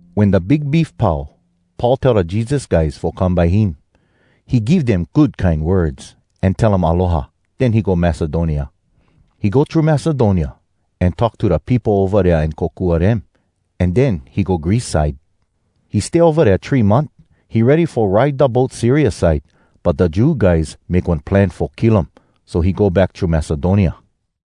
Wen da big beef pau, Paul tell da Jesus guys fo come by him. He give dem good kine words, an tell um aloha. Den he go Macedonia. He go thru Macedonia, an talk to da peopo ova dea an kokua dem. An den he go Greece side. He stay ova dea three month. He ready fo ride da boat Syria side, but da Jew guys make one plan fo kill um, so he go back thru Macedonia.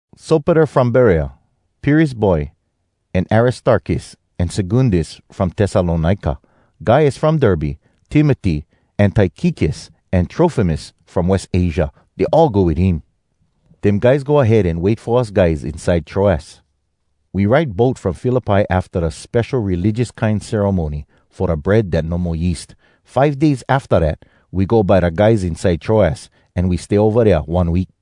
Sopater from Berea, Pyrrhus boy, an Aristarkus an Secundus from Tessalonika, Gaius from Derbe, Timoty, an Tykikus an Trofimus from West Asia, dey all go wit him. Dem guys go ahead an wait fo us guys inside Troas. We ride boat from Philippi afta da spesho religious kine ceremony fo da Bread Dat No Mo Yeast. Five days afta dat, we go by da guys inside Troas, an we stay ova dea one week.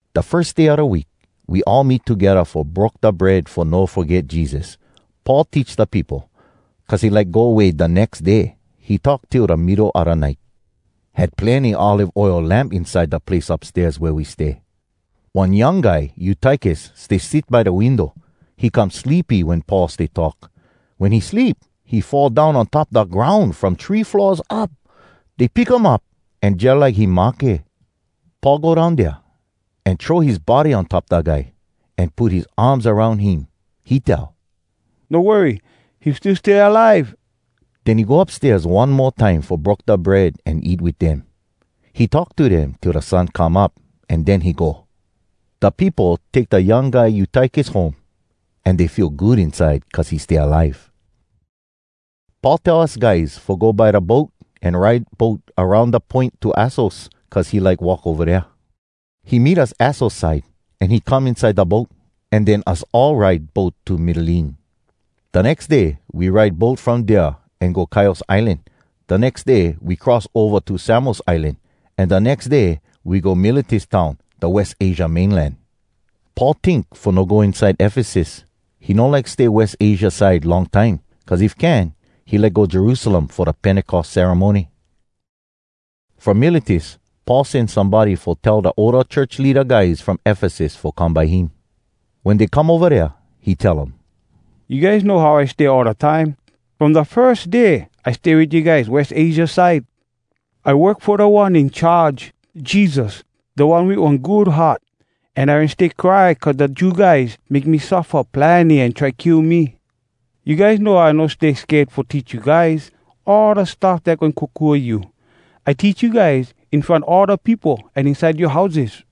Da firs day a da week, we all meet togedda fo broke da bread fo no foget Jesus. Paul teach da peopo. Cuz he like go way da nex day, he talk till da middo a da nite. Had plenny olive oil lamp inside da place upstairs wea we stay. One young guy Eutykus stay sit by da window. He come sleepy wen Paul stay talk. Wen he sleep, he fall down on top da groun from three floors up. Dey pick um up, an jalike he mahke. Paul go down dea, an throw his body on top da guy, an put his arms aroun him. He tell, “No worry, he still stay alive!” Den he go upstairs one mo time fo broke da bread an eat wit dem. He talk to dem till da sun come up, an den he go. Da peopo take da young guy Eutykus home, an dey feel good inside cuz he stay alive. Paul tell us guys fo go by da boat an ride boat aroun da poin to Assos cuz he like walk ova dea. He meet us Assos side, an he come inside da boat. An den us all ride boat to Mitylene. Da nex day we ride boat from dea an go Chios Islan. Da nex day we cross ova to Samos Islan, an da nex day, we go Miletus town, da West Asia mainland. Paul tink fo no go inside Efesus. He no like stay West Asia side long time, cuz if can, he like go Jerusalem fo da Pentecos ceremony. From Miletus Paul sen somebody fo tell da older church leada guys from Efesus fo come by him. Wen dey come ova dea, he tell um, “You guys know how I stay all da time, from da firs day I stay wit you guys West Asia side. I work fo Da One In Charge, Jesus, da one wit one good heart. An I wen stay cry cuz da Jew guys make me suffa plenny an try kill me. You guys know I no stay sked fo teach you guys all da stuff dat goin kokua you. I teach you guys in front all da peopo an inside yoa houses.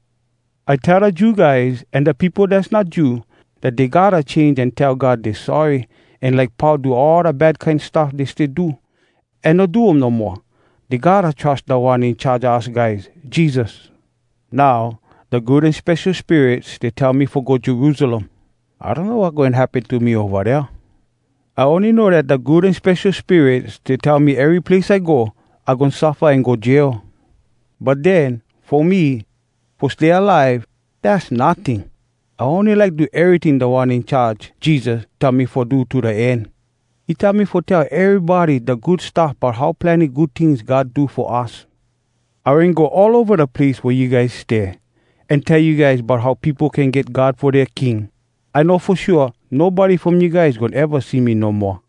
I tell da Jew guys an da peopo dass not Jew, dat dey gotta change an tell God dey sorry an like pau do all da bad kine stuff dey stay do, an no do um no moa. Dey gotta trus Da One In Charge a us guys, Jesus. Now, da Good An Spesho Spirit stay tell me fo go Jerusalem. I donno wat goin happen to me ova dea. I ony know dat da Good An Spesho Spirit stay tell me ery place I go, I goin suffa an go jail. But den, fo me, fo stay alive, dass notting. I ony like do eryting Da One In Charge, Jesus, tell me fo do to da end. He tell me fo tell erybody da Good Stuff bout how plenny good tings God do fo us. “I wen go all ova da place wea you guys stay, an tell you guys bout how peopo can get God fo dea king. I know fo shua nobody from you guys goin eva see me no moa.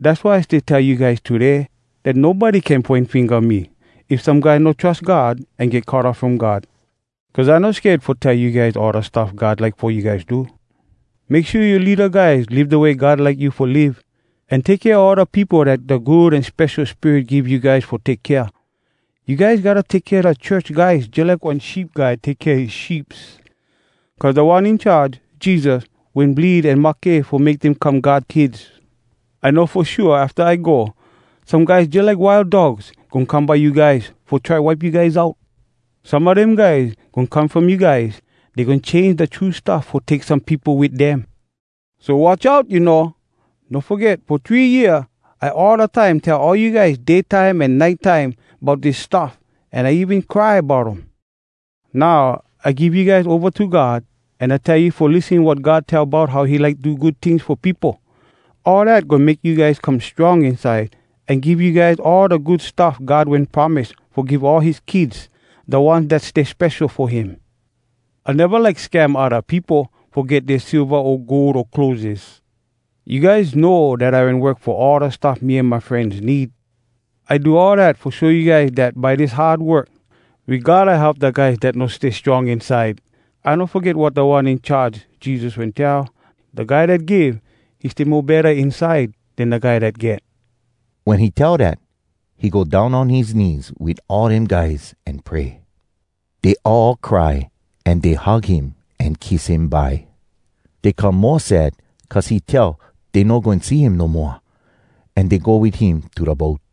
Dass why I stay tell you guys today dat nobody can poin finga me if some guy no trus God an get cut off from God. Cuz I no sked fo tell you guys all da stuff God like fo you guys do. Make shua you leada guys live da way God like you fo live. An take kea all da peopo dat da Good An Spesho Spirit give you guys fo take kea. You guys gotta take kea da church guys jalike one sheep guy take kea his sheeps. Cuz Da One In Charge, Jesus, wen bleed an mahke fo make dem come God kids. I know fo shua afta I go, some guys jalike wild dogs goin come by you guys fo try wipe you guys out. Some a dem guys goin come from you guys. Dey goin change da true stuff fo take some peopo wit dem. So watch out, you know! No foget fo three year I all da time tell all you guys day time an nite time bout dis stuff, an I even cry bout um. “Now, I give you guys ova to God, an I tell you fo lissen wat God tell bout how he like do good tings fo peopo. All dat goin make you guys come strong inside an give you guys all da good stuff God wen promise fo give all his kids, da ones dat stay spesho fo him. I neva like scam odda peopo fo get dea silva o gold o clotheses. You guys know dat I wen work fo all da stuff me an my frenz need. I do all dat fo show you guys dat by dis hard work, we gotta help da guys dat no stay strong inside. I no foget wat Da One In Charge, Jesus, wen tell, ‘Da guy dat give, he stay mo betta inside den da guy dat get.’” Wen he tell dat, he go down on his knees wit all dem guys an pray. Dey all cry an dey hug him an kiss him bye. Dey come mo sad cuz he tell dey no goin see him no moa. An dey go wit him to da boat.